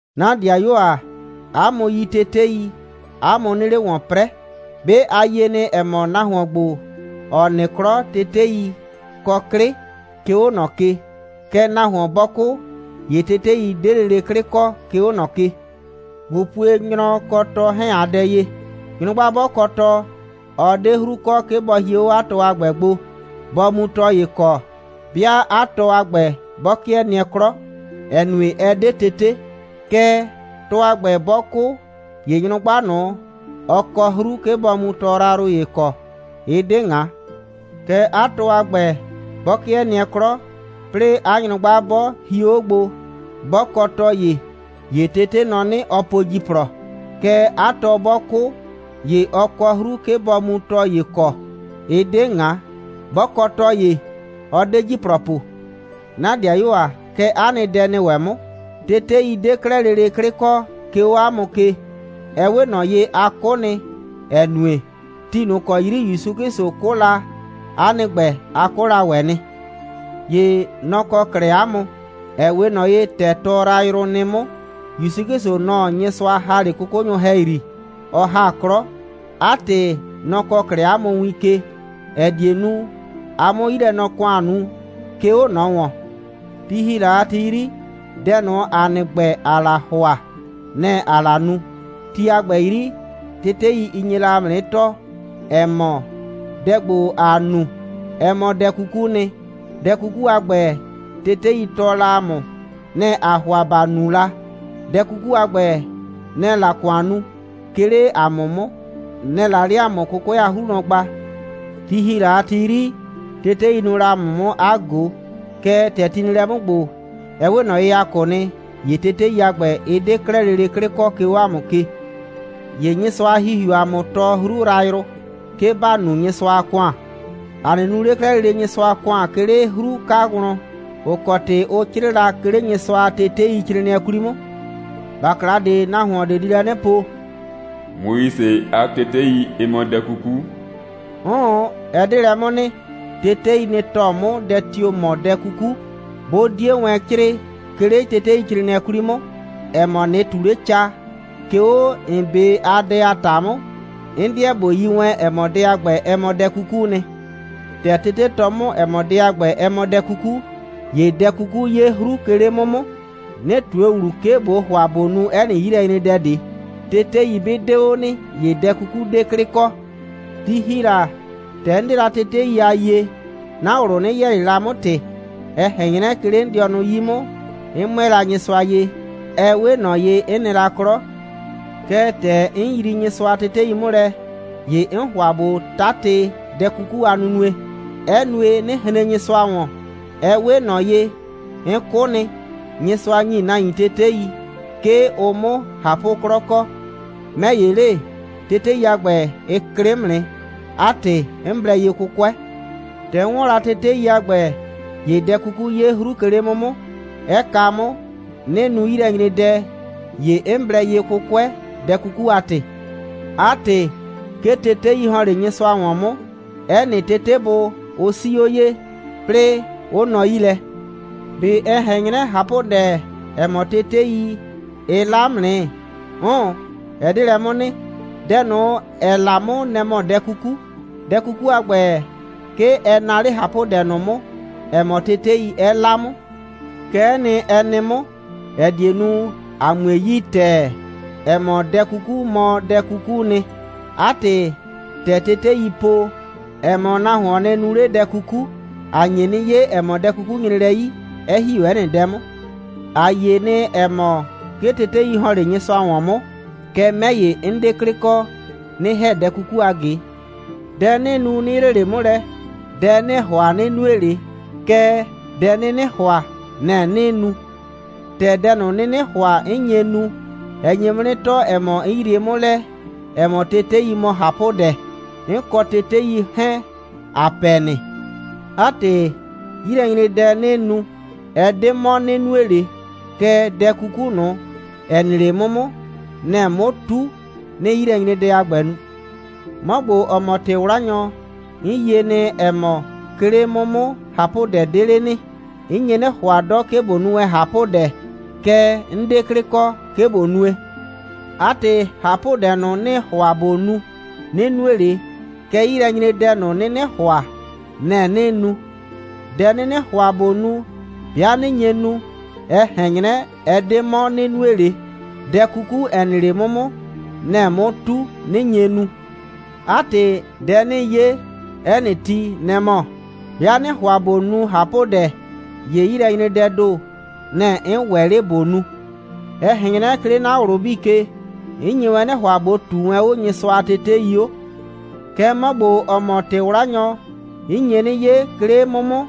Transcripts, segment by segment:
'Na ‑dɩayuo ‑a, 'a mʋ yi tetei, 'a mʋ 'nɩɩ 'le ‑wɔn 'prɛɛ. 'Be a yie nɩ, ‑ɛ mɔ, nahuon ‑gbo, ‑ɔ nɩ 'klɔ, tetei kɔ 'klɩ, 'ke 'o ꞊nɔ ke. Kɛɛ, nahuon 'bɔ 'kʋ, ‑ye tetei 'de lele 'klɩ kɔ, 'ke 'o ꞊nɔ ke. ꞊Bo pue nyrɔ kɔ 'a tɔ 'hɛɛn a dɛ ye! Nyrʋgba 'bɔ kɔ tɔ, ɔ 'de 'hru kɔ, 'ke bɔ hie 'o 'a tɔ a ‑gbɛ gbo, bɔ mu tɔ ‑ye kɔ, 'bɩa 'a tɔ a ‑gbɛ, 'bɔ 'kɩɛ nɩɛ 'klɔ, ‑ɛ nue, ɛ 'de tete. Kɛɛ, tɔ a ‑gbɛ, 'bɔ 'kʋ, ‑ye nyrʋgba ꞊nʋ, ɔ kɔ 'hru, 'ke bɔ mu tɔ yrayrʋ ‑ye kɔ. Ɩ 'de ꞊ŋa. Kɛɛ, 'a tɔ a ‑gbɛ, 'bɔ 'kɩɛ nɩɛ 'klɔ, 'plɩɩ 'a nyrʋgba 'bɔ hio 'o gbo, 'bɔ kɔ tɔ ‑ye, ‑ye tete nɔ 'nɩ, ɔ po ‑jiplɔ. Kɛɛ, 'a tɔ 'bɔ 'kʋ, ‑ye ɔ kɔ 'hru, 'ke bɔ mu tɔ ‑ye kɔ. Ɩ 'de ꞊ŋa. 'Bɔ kɔ tɔ ‑ye, ɔ 'de ‑jiplɔ po. 'Na ‑dɩayuo ‑a, kɛ 'a nɩ dɛ nɩ ‑wɛ 'mʋ. Tetei 'de 'klɛɛ lele 'klɩ kɔ, 'ke 'o 'a mʋ ke. Ɛ 'we ꞊nɔ ye, a 'kʋ nɩ, ‑ɛ nue, ti ꞊nʋ ‑kɔ 'yri ‑Yusu 'Klɩsʋ 'kʋ la, 'a nɩ ‑gbɛ, a 'kʋ la ‑wɛ nɩ. ‑Ye nɔ‑ kɔ 'klɛɛ 'a mʋ, ‑ɛ 'we ꞊nɔ ye, ‑tɛ tɔ yrayrʋ nɩ 'mʋ. ‑Yusu 'Klɩsʋ, nɔ‑ Nyɩsʋa ‑ha 'le 'kʋkʋnyʋ ‑hɛyri, ɔ ‑ha 'klɔ. 'A ‑tɩ, nɔ‑ kɔɔ 'klɛɛ ‑a mʋ win ke, ‑ɛ die nu, ‑a 'mʋ 'yilɛnɔ‑kʋan nu, 'ke 'o ꞊nɔ ‑wɔn. Ti ‑hi la a ti 'yri, dɛ ꞊nʋ, ‑a nɩ ‑gbɛ, ‑aa la ‑hʋa, nɛ‑ ‑aa la nu. Ti a ‑gbɛ 'yri, tetei, ɩ nye la ‑a mʋ 'nɩ tɔɔ, ‑ɛ mɔ, dɛ ‑gbo, ‑aa nu, ɛ mɔ dɛ 'kukuu nɩ. Dɛ 'kuku a ‑gbɛ, tetei tɔɔ la ‑a mʋ, nɛ‑ ‑aa ‑hʋa ‑ba nu la. Dɛ 'kuku a ‑gbɛ, nɛ‑ɛ la ‑kʋan nu, 'ke 'le ‑a mʋ 'mʋ, nɛ‑ɛ la 'le ‑a mʋ 'kʋkʋɛ a 'hru wlɔn gba. Ti ‑hi la a ti 'yri, tetei nuu la ‑a mʋ 'mʋ 'a ꞊go. Kɛɛ, ‑tɛ ti nɩ lɛ 'mʋ ‑gbo, ɛ 'we ꞊nɔ ye, ‑a 'kʋ nɩ, ‑ye tetei a ‑gbɛ, ɩ 'de 'klɛɛ lele 'klɩ kɔ, 'ke 'o ‑a mʋ ke. ‑Ye Nyɩsʋa a ‑Hihiuu ‑a mʋ tɔɔ 'hru yrayrʋ, 'ke ‑ba nu Nyɩsʋa a ‑kʋan. ‑A 'nɩ nu ꞊le 'klɛɛ lele Nyɩsʋa a ‑kʋan, 'ke 'le 'hru 'ka wlɔn, ‑ʋ kɔ ‑tɩ ʋ 'crɩɩ la, 'ke 'le Nyɩsʋa a teteicrɩɩnɩɛ 'kwli 'mʋ. ‑Bakla ꞊de, nahuon ꞊de di lɛ 'nɩ po: «Moise a tetei, ɩ mɔ dɛ 'kuku.» 'Ʋʋn, ɛ 'de lɛ 'mʋ nɩ. Tetei, nɩ‑ tɔɔ 'mʋ, dɛ tio‑ mɔ dɛ 'kuku. 'Bʋ 'die wɛn 'crɩɩ, 'ke 'le teteicrɩɩnɩɛ 'kwli 'mʋ, ‑ɛ mɔ, ꞊nɩ ꞊tu 'le ca, 'ke 'o ‑n 'be a dɛ a ‑ta 'mʋ, 'n 'deɛ ꞊bo yi wɛn, ‑ɛ mɔ, dɛ a ‑gbɛ, ɛ mɔ dɛ 'kukuu nɩ. ‑Tɛ tete tɔɔ 'mʋ, ‑ɛ mɔ, dɛ a ‑gbɛ, ɛ mɔ dɛ 'kuku, ‑ye dɛ 'kuku 'ye 'hru, 'ke 'le 'mʋ 'mʋ, 'nɩ ꞊tue ‑wlu, 'ke ꞊bo ‑hʋa ꞊bo nu 'ɛ nɩ 'yilɛnyredɛ ꞊de. Tetei 'bɩ 'de 'o nɩ, ‑ye dɛ 'kuku 'de 'klɩ kɔ. Ti ‑hi la, ‑tɛ 'n 'de la tetei a yie, 'na ꞊wlʋ 'nɩ yɛɛ ꞊le la 'mʋ ‑tɩ. Ɛ ꞊hɛn 'nyrɛ, 'ke 'le 'n dɩɔnʋ 'yi 'mʋ, 'n 'mʋɛɛ la Nyɩsʋa ye. Ɛ 'we ꞊nɔ ye, 'n nɩ la 'klɔ. Kɛɛ, ‑tɛ 'n yrii Nyɩsʋa a tetei 'mʋ lɛ, ‑ye 'n ‑hʋa ꞊bo 'tatɩ dɛ 'kuku a nunue, 'ɛ nue, 'nɩ hren Nyɩsʋa ‑wɔn. Ɛ 'we ꞊nɔ ye, 'n 'kʋ nɩ. Nyɩsʋa ‑nyi nahuin tetei, 'ke ʋ 'mʋ ꞊hapʋ'klɔ kɔ. 'Mɛ ‑ye le, tetei a ‑gbɛ, ɩ klɩ 'mʋ nɩ. 'A ‑tɩ, 'n blɛ ye 'kʋkʋɛ. ‑Tɛ 'n 'wɔn la tetei a ‑gbɛ, ‑ye dɛ 'kuku 'ye 'hru, 'ke 'le 'mʋ 'mʋ, 'ɛ kaa 'mʋ, 'nɩ nu 'yilɛnyredɛ. ‑Ye 'n blɛ ye 'kʋkʋɛ, dɛ 'kuku a ‑tɩ. 'A ‑tɩ, 'ke tetei ‑hɔn 'le Nyɩsʋa ‑wɔn 'mʋ. 'Ɛ nɩ tetebʋ, ʋ 'sii 'o ye, 'plɩɩ 'ʋ nɔ 'yi lɛ. ꞊Be ɛ ꞊hɛn 'nyrɛ, ꞊hapʋdɛ, ‑ɛ mɔ, tetei, ɩ 'la 'mʋ nɩ? 'Ʋʋn, ɛ 'de lɛ 'mʋ nɩ. Dɛ ꞊nʋ, ‑ɛ 'la 'mʋ, nɛ‑ mɔ dɛ 'kuku. Dɛ 'kuku a ‑gbɛ, 'ke ɛ naa 'le ꞊hapʋdɛ ꞊nʋ 'mʋ, ‑ɛ mɔ tetei, 'ɛ 'la 'mʋ. Kɛ'ɛ nɩ, ɛ nɩ 'mʋ, ‑ɛ die nu, ‑a 'mue yi ‑tɛɛ, ‑ɛ mɔ, dɛ 'kuku mɔ dɛ 'kukuu nɩ. 'A ‑tɩ, ‑tɛ teteii po, ‑ɛ mɔ, nahuon nɩ nu 'le dɛ 'kuku, ‑a nye 'nɩ 'ye, ‑ɛ mɔ, dɛ 'kuku nyre lɛ 'yi, 'ɛ ‑hi 'o 'ɛ nɩ dɛ 'mʋ. ‑A yie nɩ, ‑ɛ mɔ, 'ke tetei ‑hɔn 'le Nyɩsʋa ‑wɔn 'mʋ, kɛɛ, 'mɛ ‑ye, 'n 'de 'klɩ kɔ, 'nɩ ‑hɛ dɛ 'kuku a ꞊ge. Dɛ 'nɩɩ nu, 'nɩ yrie ꞊le 'mʋ lɛ. Dɛ 'nɩɩ ‑hʋa, 'nɩ nue ꞊le, kɛɛ, dɛ 'nɩnɩ ‑hʋa, nɛ‑ 'nɩɩ nu. ‑Tɛ dɛ ꞊nʋ, 'nɩnɩ ‑hʋa, 'n nye nu, ɛ nye 'mʋ 'nɩ tɔɔ, ‑ɛ mɔ, 'n yrie 'mʋ lɛ, ‑ɛ mɔ, tetei mɔ ꞊hapʋdɛ. 'N kɔ tetei 'hɛɛn, ‑a pɛ nɩ. 'A ‑tɩ, 'yilɛnyredɛ, 'nɩɩ nu, ɛ 'de 'mɔ, 'nɩ nue ꞊le, kɛɛ, dɛ 'kuku ꞊nʋ, ‑ɛ nɩ 'le 'mʋ 'mʋ, nɛ‑ɛ 'mʋ 'tu, 'nɩɩ 'yilɛnyredɛ a ‑gbɛ nu. 'Mɔ ‑gbo, ‑ɔ mɔ ‑tɩ'wlanyɔ, 'n yie nɩ, ‑ɛ mɔ, 'ke 'le 'mʋ 'mʋ, ꞊hapʋdɛ 'de 'le nɩ. 'N nye 'nɩ ‑hʋa 'dɔ, 'ke ꞊bo nu wɛn ꞊hapʋdɛ, kɛɛ, 'n 'de 'klɩ kɔ, 'ke ꞊bo nue. 'A ‑tɩ, ꞊hapʋdɛ ꞊nʋ, 'nɩɩ ‑hʋa ꞊bo nu, 'nɩ nue ꞊le. Kɛɛ 'yilɛnyredɛ ꞊nʋ, 'nɩnɩ ‑hʋa, nɛ‑ 'nɩɩ nu. Dɛ 'nɩnɩ ‑hʋa ꞊bo nu, 'bɩa 'nɩ nye nu, ɛ ꞊hɛn 'nyrɛ, ɛ 'de 'mɔ, 'nɩ nue ꞊le, dɛ 'kuku, ‑ɛ nɩ 'le 'mʋ 'mʋ, nɛ‑ɛ 'mʋ 'tu, 'nɩ nye nu. 'A ‑tɩ, dɛ 'nɩɩ 'ye 'ɛ nɩ ti, nɛ‑ mɔ: 'Bɩa 'nɩɩ ‑hʋa ꞊bo nu ꞊hapʋdɛ, ‑ye 'yilɛnyredɛɛ ‑do, nɛ‑ 'n ‑wɛ 'le ꞊bo nu. Ɛ ꞊hɛn 'nyrɛ, 'ke 'le 'na ꞊wlʋ 'bii ke, 'n nye wɛn 'nɩ ‑hʋa, ꞊bo ꞊tuu wɛn 'o Nyɩsʋa a tetei 'o. Kɛɛ, 'mɔ ‑gbo, ‑ɔ mɔ ‑tɩ'wlanyɔ, 'n nye 'nɩ 'ye, 'ke 'le 'mʋ 'mʋ,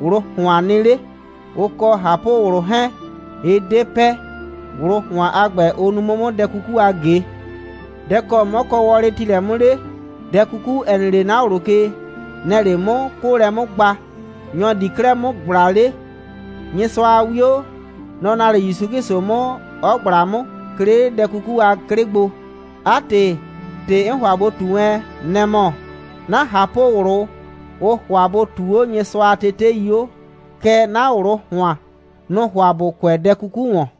꞊wlʋ ‑hʋan nɩ 'le. Ʋ kɔ ꞊hapʋ꞊wlʋ 'hɛɛn, ɩ 'de pɛ. ꞊Wlʋ ‑hʋan a ‑gbɛ, ʋ nu 'mʋ 'mʋ dɛ 'kuku a ꞊ge. Dɛ‑ kɔ 'mɔ kɔ wɔlɩ ‑ti lɛ 'mʋ 'le? Dɛ 'kuku, ‑ɛ nɩ 'le 'na ꞊wlʋ ke, nɛ‑ɛ 'le 'mʋ 'kʋʋlɛ 'mʋ gba. Nyɔ‑ di 'klɛɛ 'mʋ ꞊gbla 'le? Nyɩsʋa a 'wio. Nɔ‑ naa 'le ‑Yusu 'Klɩsʋ 'mʋ, 'ɔ ꞊gbla 'mʋ, 'ke 'le dɛ 'kuku a 'klɩ gbo. 'A ‑tɩ, ‑tɩ 'n ‑hʋa ꞊bo ꞊tu wɛn, nɛ‑ mɔ: 'na ꞊hapʋ꞊wlʋ, ʋʋ ‑hʋa bʋ ꞊tuu 'o Nyɩsʋa a tetei 'o. Kɛɛ, 'na ꞊wlʋ ‑hʋan, nʋ‑ʋ ‑hʋa ‑bʋ kʋɛ dɛ 'kuku ‑wɔn.